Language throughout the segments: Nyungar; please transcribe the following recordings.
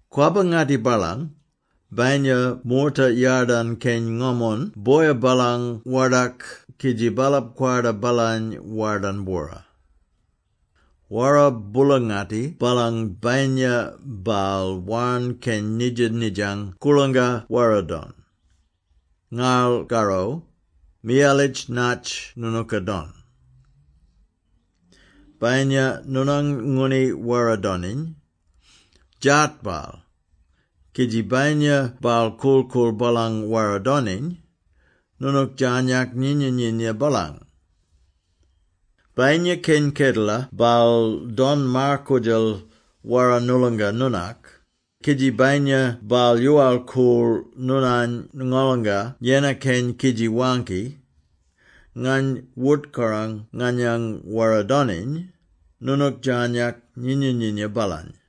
Kwabba-ngatti baalang, bayinya moorta yadarn keny ngomon boya baalang wordak kidji baalap kwarda baalany wardarn-bwora! Wara boola-ngatti baalang bayinya baal warn keny nidja-nidjang koorlangka wara-don! Ngarl karro, miyalitj natj noonooka don! “Bayinya noonang ngooni wara-doniny, djaat baal; kidji bayinya baal korl-koorl baalang wara-doniny, noonook djarnyak nyinya-nyinya baalany. Bayinya keny kedela baal don maar-koodjal wara noolonga noonak, kidji bayinya baal yoowal-koorl noonany ngolonga yennar keny kidji waangki, ‘Ngany wort-korang nganyang wara-doniny,’ noonook djarnyak nyinya-nyinya baalany.”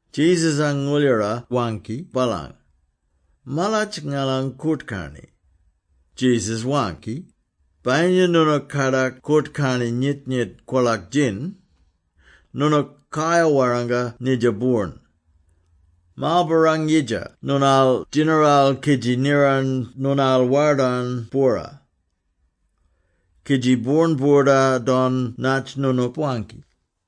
Jesus-ang ngooldjara waangki baalany, “Malatj ngalang koort-karni!” Jesus waangki, “Bayinya noonooka kadak koort-karni nyit-nyit kwolak-djin, noonook kayar-warranga nidja boorn, ‘Marlbarrang-yidja noonaal djinaral kidji niran noonaal wardarn-bwora.’ Kidji boorn boorda-don natj noonook waangki.”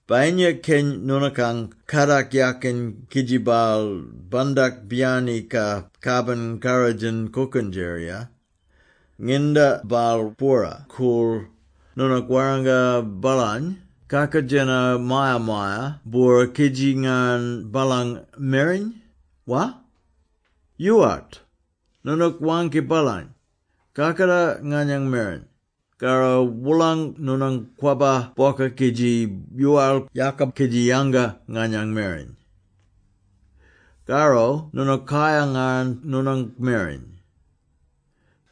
“Bayinya keny noonookang kadak yakin kidji baal bandak biyaniny ka kabin karrodjin kookendjerira. Nginda baal bwora-koorl, noonook warranga baalany kakoodjeno maya-maya-bwora kidji ngarn baalang mereny, wa? Yoowart! Noonook waangki baalany, ‘Kakatar nganyang mereny, karro wolang noonang kwabba bwoka kidji yoowal-yaaka kidji yanga nganyang mereny. Karro noonook kayar-ngarn noonang mereny.’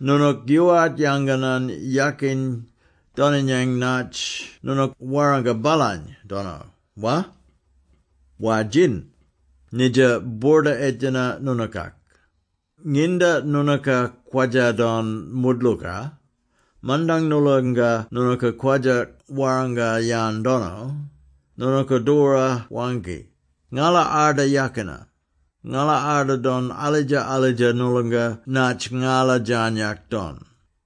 Noonook yoowart yanganan yakin doninyang natj noonook warranga baalany dono, wa? War-djin, nidja boorda-edjena noonookak. Nginda noonooka kwadja-don moodlooka, mandang noolonga noonooka kwadja warranga-yan dono, noonooka doora waangki, ‘Ngala arda yakina; ngala arda don alidja-alidja noolonga natj ngala djarnyak don.’”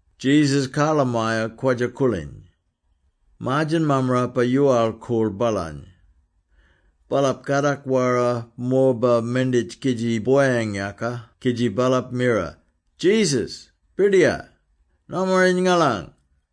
Jesus karlamaya kwadja-koorliny. Maar-djen mammarapa yoowal-koorl baalany. Baalap kadak wara morba menditj kidji boyang-yaaka kidji baalap mira, “Jesus! Birdiyar! Nomaring ngalany!”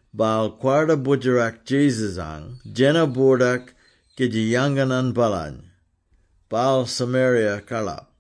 Baal kwarda boodjerak Jesus-ang djena-boordak kidji yanganan baalany. Baal Samaria-karlap.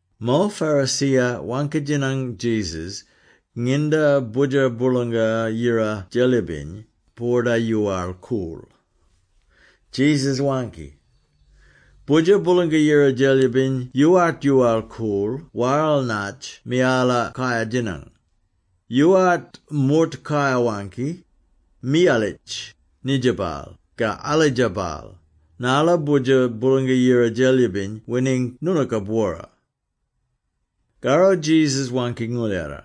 Mo Pharisee-ya waangki-djinang Jesus nginda Boodjer Boolanga-Yira Djelyibiny boorda-yoowal-koorl. Jesus waangki, “Boodjer Boolanga-Yira Djelyibiny yoowart yoowal-koorl waral natj miyala kayar-djinang. Yoowart moort kayar-waangki, ‘Miyalitj! Nidja baal!’ ka ‘Alidja baal!’ narla Boodjer Boolanga-Yira Djelyibiny wining noonooka-bwora.” Karro Jesus waangki ngooldjara,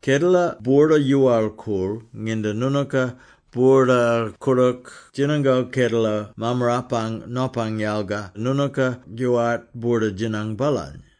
“Kedela boorda-yoowal-koorl nginda noonooka boorda-koordook djinango kedela Mammarapang Nopang yalga noonooka yoowart boorda-djinang baalany.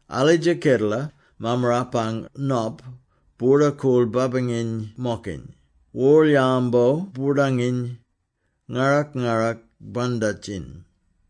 Alidja kedela, Mammarapang Nop boorda-koorl babanginy-mokiny, worl-yambo boordanginy, ngarrak-ngarrak bandjatiny.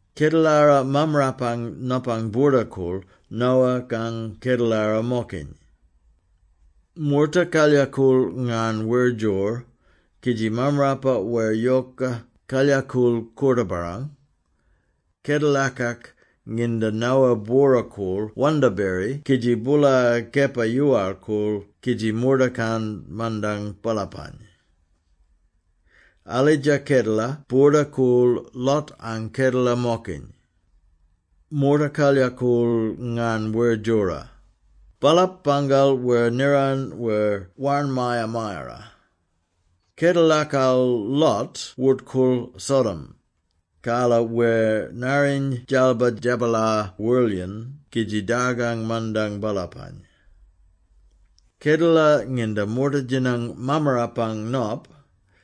“Kedelara Mammarapang Nopang boorda-koorl Noah-kang kedelara-mokiny. Moorta kalyakool ngarn wer djor, kidji mammarapa wer yoka kalyakool koorta-barrang, kedelakak nginda Noah bwora-koorl wandaberi kidji boola kepa yoowal-koorl kidji mordakan mandang baalapany. Alidja kedela boorda-koorl Lot-ang kedela-mokiny. Moorta kalyakool ngarn wer djora. Baalap bangal wer niran wer warn maya-mayara. Kedelakal Lot wort-koorl Sodom, karla wer narriny dalba djabalar worlyen kidji dargang mandang baalapany. Kedela nginda moorta djinang Mammarapang Nop,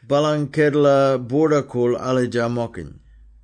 baalang kedela boorda-koorl alidja-mokiny.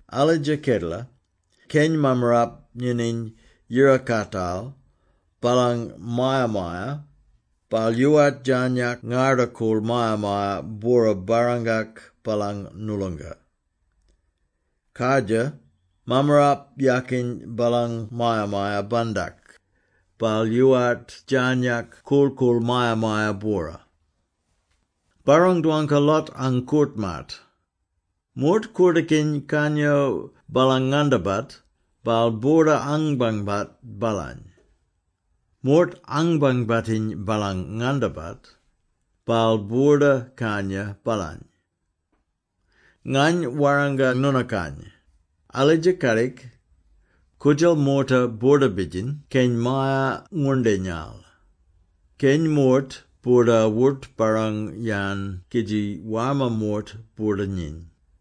Alidja kedela, keny mammarap nyinyiny yirakaatal baalang maya-maya, baal yoowart djarnyak ngarda-koorl maya-maya-bwora barrangak baalang noolonga. Kardjir, mammarap yaakiny baalang maya-maya-bandak, baal yoowart djarnyak korl-koorl maya-maya-bwora. Barrang-dwangka Lot-ang koort-maat! Moort koordookiny kanyo baalang ngandabat, baal boorda-anbangbat baalany. Moort anbangbatiny baalang ngandabat, baal boorda-kanya baalany. Ngany warranga noonookany, alidja kadik, koodjal moorta boorda-bidjiny keny maya-ngwoorndinyal; keny moort boorda-wort-barrang-yan kidji warma moort boorda-nyiny.”